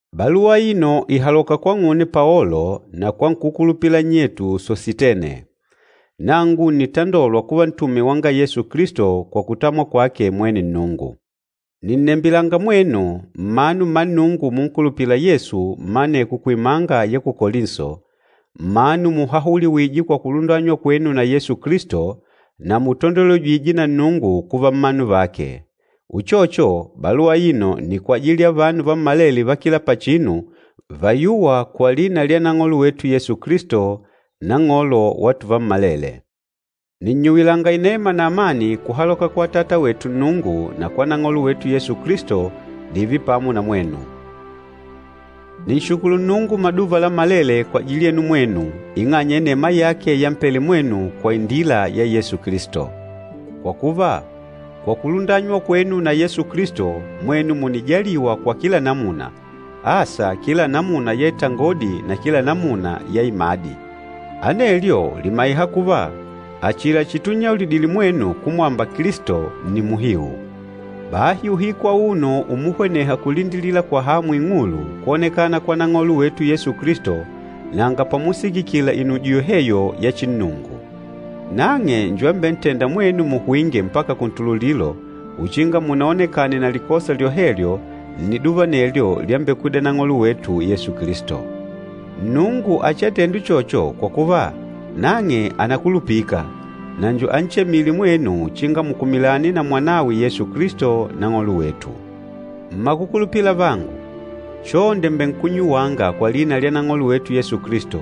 Baluwa aino ìhaloka kwang'une Paolo na kwa nkúkulupila nnyetu Sositene. Nangu ǹnitandolwa kuva ntume wanga Yesu Kilisto kwa kutamwa kwake mwene Nnungu. Nìnnembilanga mwenu, mmanu mma Nnungu munkulupîla Yesu mma aneko kuimanga ya ku Kolinso, mmanu muhahuliwîje kwa kulundanywa kwenu na Yesu Kilisto, na mutandolwejîje na Nnungu kuva mmanu vake. Uchocho, baluwa aino nni kwajili ya vanu vammalele va kila pachinu vayûwa kwa lina lya Nang'olo wetu Yesu Kilisto, Nang'olo wa tuvammalele. Nìnnyuwilanga inema na amani kuhaloka kwa Atata wetu Nnungu na kwa Nang'olo wetu Yesu Kilisto dììve pamo na mwenu. Nìnshukulu Nnungu maduva lammalele kwajili yenu mwenu ing'anya ya inema yake yampele mwenu kwa indila ya Yesu Kilisto. Kwa kuva, kwa kulundanywa kwenu na Yesu Kilisto mwenu mùnijaliwa kwa kila namuna, asa kila namuna ya itangodi na kila namuna ya imadi. Anelyo lìmaiha kuva, achila chitunnyaulidile mwenu kumwamba Kilisto nni muhiu. Bahi uhiku auno umuhweneha kulindilila kwa hamu ing'ulu kwonekana kwa Nang'olo wetu Yesu Kilisto, nanga pamusikikila inujo yoheyo ya chinnungu. Nang'e njo ambentênda mwenu muhwinge mpaka kuntululilo uchinga munaonekane na likosa lyohelyo nniduva anelyo lyambekwida Nang'olo wetu Yesu Kilisto. Nnungu achiatende uchocho kwa kuva, nang'e ànakulupika, na njo anchemîle mwenu uchinga mukumilane na Mwanawe Yesu Kilisto Nang'olo wetu. Mmakukulupila avangu, chonde mbènkunnyuwanga kwa lina lya Nang'olo wetu Yesu Kilisto,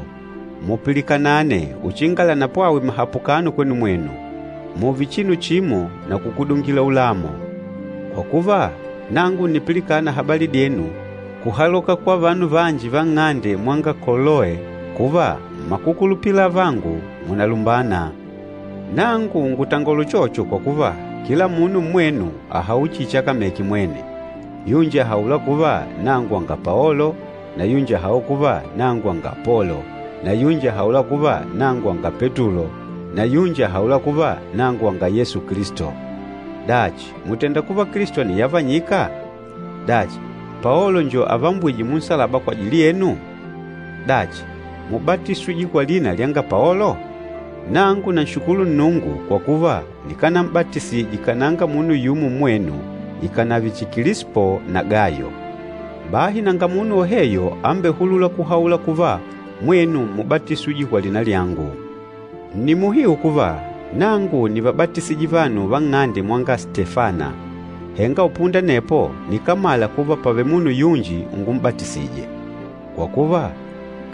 mupilikanane uchinga lanapwawe mahapukano kwenu mwenu. Mùùve chinu chimo na kukudungila ulamo. Kwa kuva, nangu ǹnipilikana habali dyenu kuhaloka kwa vanu vanji va nng'ande mwanga Koloe, kuva mmakukulupila avangu, munalumbana. Nangu ngùtangola uchocho kwa kuva, kila munu mmwenu àhaula chihi chakameke mwene. Yunji àhaula kuva, “Nangu wanga Paolo,” na yunji àhaula kuva, “Nangu wanga Apolo,” na yunji àhaula kuva, “Nangu wanga Petulo,” na yunji àhaula kuva, “Nangu wanga Yesu Kilisto.” Dachi, mùtenda kuva Kilisto àniyavanyika? Dachi, Paolo njo avambwîje munsalaba kwajili yenu? Dachi, múbatiswije kwa lina lyanga Paolo? Nangu nanshukulu Nnungu kwa kuva nikánam'batisije kananga munu yumo mmwenu ikànave chihi Kilispo na Gayo. Bahi nanga munu woheyo ambehulûla kuhaula kuva mwenu múbatiswije kwa lina lyangu. Nni muhiu kuva, nangu nívabatisije vanu va nng'ande mwanga Stefana, henga upunda anepo nikámala kuva pàvele munu yunji ungum'batisije. Kwa kuva,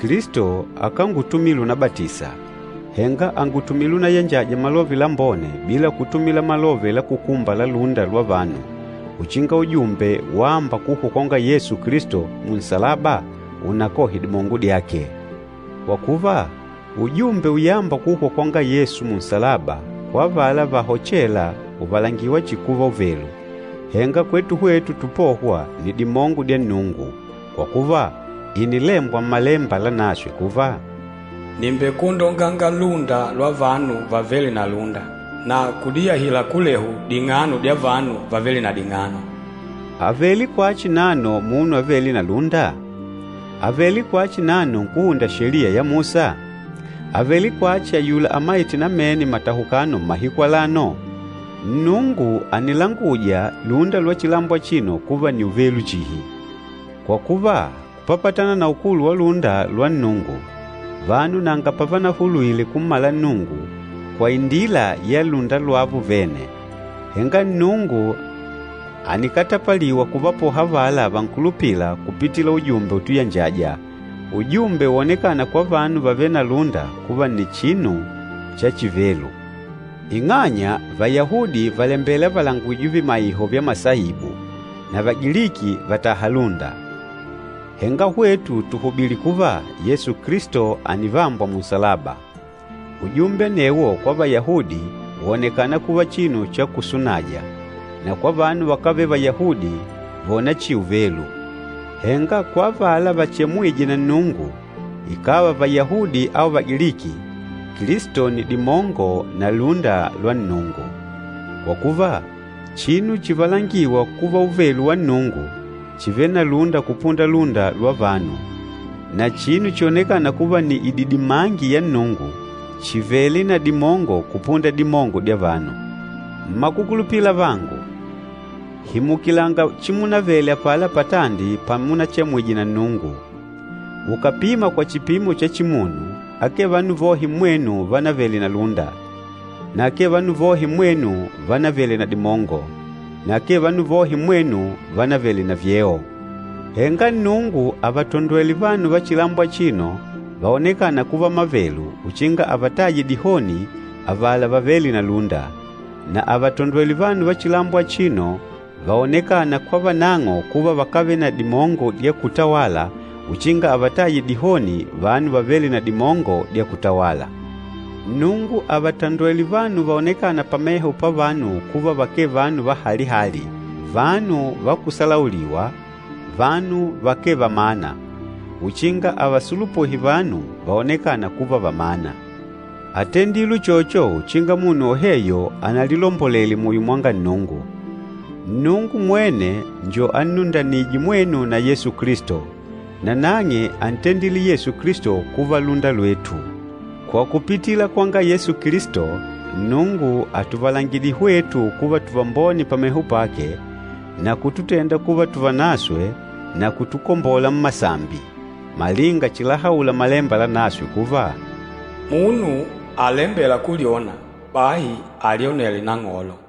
Kilisto akángutumile unabatisa, henga àngutumile unayanjaja Malove Lambone bila kutumila malove la kukumba la lúnda lwa vanu, uchinga ujumbe wâmba kuhwa kwanga Yesu Kilisto munsalaba unakohe dimongo dyake. Kwa kuva, ujumbe uyâmba kuhwa kwanga Yesu munsalaba, kwa avala vahochêla ùvalangiwa chihi kuva uvelu, henga kwetu hwetu tupôhwa nni dimongo dya Nnungu. Kwa kuva, ìnilembwa Mmalemba Lanaswe kuva, “Nìmbekwondonganga lúnda lwa vanu vavêle na lúnda, na kudiyahila kulehu ding'ano dya vanu vavêle na ding'ano.” Àvele kwachi nano munu avêle na lúnda? Àvele kwachi nano nkúhunda Sheliya ya Musa? Àvele kwachi ayula amaîte namene matahukano mmahiku alano? Nnungu ànilanguja lúnda lwa chilambo achino kuva nni uvelu chihi! Kwa kuva, kupapatana na ukulu wa lúnda lwa Nnungu, vanu nanga pavanahulwile kummala Nnungu kwa indila ya lúnda lwavo vene. Henga Nnungu ànikatapaliwa kuvapoha avala vankulupîla kupitila ujumbe utuyanjaja, ujumbe wonekâna kwa vanu vavêle na lúnda kuva nni chinu cha chivelu. Ing'anya Vayahudi vàlembela valangujwe vimaiho vya masaibu na Vagiliki vàtaha lúnda, henga hwetu tùhubili kuva, Yesu Kilisto ànivambwa munsalaba. Ujumbe anewo kwa Vayahudi wònekana kuva chinu cha kusunaja na kwa vanu vakávele Vayahudi vòna chihi uvelu. Henga kwa avala vachemwîje na Nnungu, ikàva Vayahudi au Vagiliki, Kilisto nni dimongo na lúnda lwa Nnungu. Kwa kuva, chinu chivalangîwa kuva uvelu wa Nnungu, chìvele na lúnda kupunda lúnda lwa vanu, na chinu chionekâna kuva nni ididimangi ya Nnungu, chìvele na dimongo kupunda dimongo dya vanu. Mmakukulupila avangu, himukilanga chimunavele apala patandi pamunachemwije na Nnungu. Ukàpima kwa chipimo cha chimunu, akee vanu vohe mmwenu vanavele na lúnda, na akee vanu vohe mmwenu vánavele na dimongo, na akee vanu vohe mmwenu vánavele na vyeo. Henga Nnungu àvatondwele vanu va chilambo achino vaonekâna kuva mavelu uchinga avataye dihoni avala vavêle na lúnda. Na àvatondwele vanu va chilambo achino vaonekâna kwa vanang'o kuva vakávele na dimongo dya kutawala, uchinga avataye dihoni vanu vavêle na dimongo dya kutawala. Nnungu àvatondwele vanu vaonekâna pameho pavanu kuva vakee vanu va hali-hali, vanu va kusalauliwa, vanu vakee vamana, uchinga ávasulupuhe vanu vaonekâna kuva vamana. Átendile uchocho uchinga munu woheyo analilombolele muyo mwa Nnungu. Nnungu mwene njo ánnundanije mwenu na Yesu Kilisto, nanang'e ántendile Yesu Kilisto kuva lúnda lwetu. Kwa kupitila kwanga Yesu Kilisto, Nnungu àtuvalangidile hwetu kuva tuvambone pameho pake, na kututenda kuva tuvanaswe na kutukombola mmasambi. Malinga chilahaula Malemba Lanaswe kuva, “Munu alembêla kulyona, bahi alyonele Nang'olo.”